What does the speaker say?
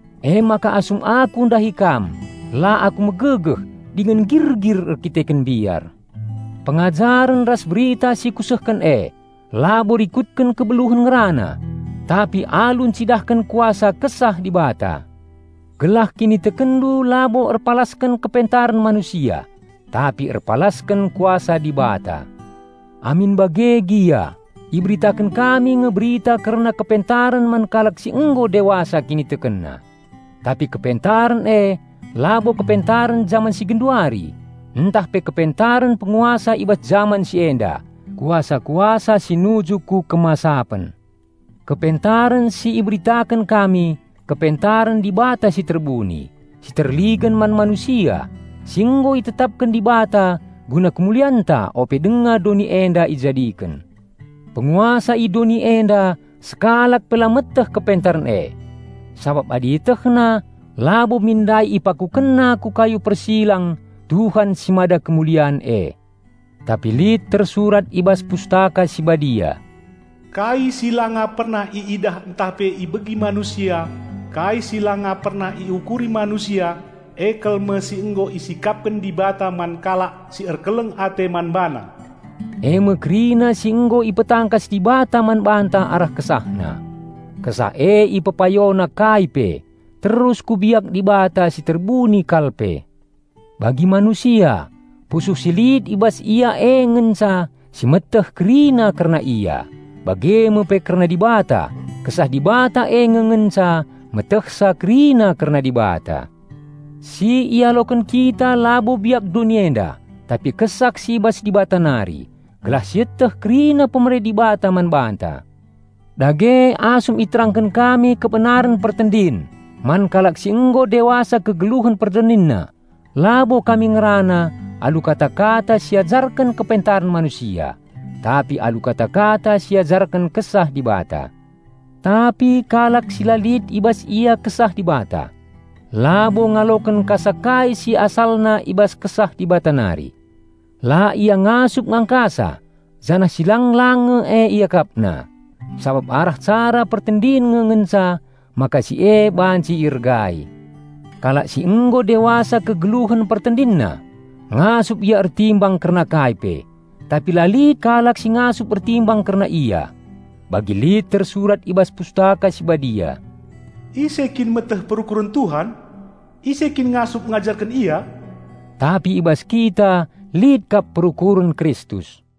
Emaka asum aku ndahi kam la aku megegeh dingen nggirgir erdandanken mbiar. Pengajaren ras berita si kusehken e labo rikutken kebeluhen ngerana, tapi alu ncidahken kuasa Kesah Dibata. Gelah kinitekenndu labo erpalasken kepentaren manusia, tapi erpalasken Kuasa Dibata. Amin bage gia, iberitaken kami nge berita kerna kepentaren man kalak si nggo dewasa kinitekenna. Tapi kepentaren e labo kepentaren jaman si genduari, ntah pe kepentaren penguasa i bas jaman si enda, kuasa-kuasa si nuju ku kemasapen. Kepentaren si iberitaken kami kepentaren Dibata si terbuni, si terligen man manusia, si nggo itetapken Dibata guna kemulianta ope denga doni enda ijadiken. Penguasa i doni enda sekalak pe la meteh kepentaren e. Sabap adi ietehna, labo min ndai ipakukenna ku kayu persilang Tuhan si mada kemulian e. Tapi lit tersurat i bas Pustaka Si Badia, "Kai si langa pernah iidah ntah pe ibegi manusia, kai si langa pernah iukuri manusia, e kal me si nggo isikapken Dibata man kalak si erkeleng ate man BaNa." Eme kerina si nggo ipetangkas Dibata man banta arah KesahNa. Kesah e ipepayona kai pe, terus ku biak Dibata si terbuni kal pe. Bagi manusia, pusuh si lit i bas ia e ngenca si meteh kerina kerna ia, bage me pe kerna Dibata, Kesah Dibata e nge ngenca metehsa kerina kerna Dibata. Si ialoken kita labo biak doni enda, tapi Kesah si i bas Dibata nari, gelah sieteh kerina pemere Dibata man banta. Dage asum iterangken kami kebenaren pertendin man kalak si nggo dewasa kegeluhen pertendinna labo kami ngerana alu kata-kata si iajarken kepentaren manusia, tapi alu kata-kata si iajarken Kesah Dibata. Tapi kalak si la lit i bas ia Kesah Dibata, labo ngaloken kasa kai si asalna i bas Kesah Dibata nari. La ia ngasup ngangkasa, janah si lang-lang nge e iakapna, sabap arah cara pertendin nge ngenca maka si e banci iergai. Kalak si nggo dewasa kegeluhen pertendinna, ngasup ia ertimbang kerna kai pe, tapi la lit kalak si ngasup ertimbang kerna ia. Bagi lit tersurat i bas Pustaka Si Badia, "Ise kin meteh perukuren Tuhan? Ise kin ngasup ngajarken Ia?" Tapi i bas kita lit kap perukuren Kristus.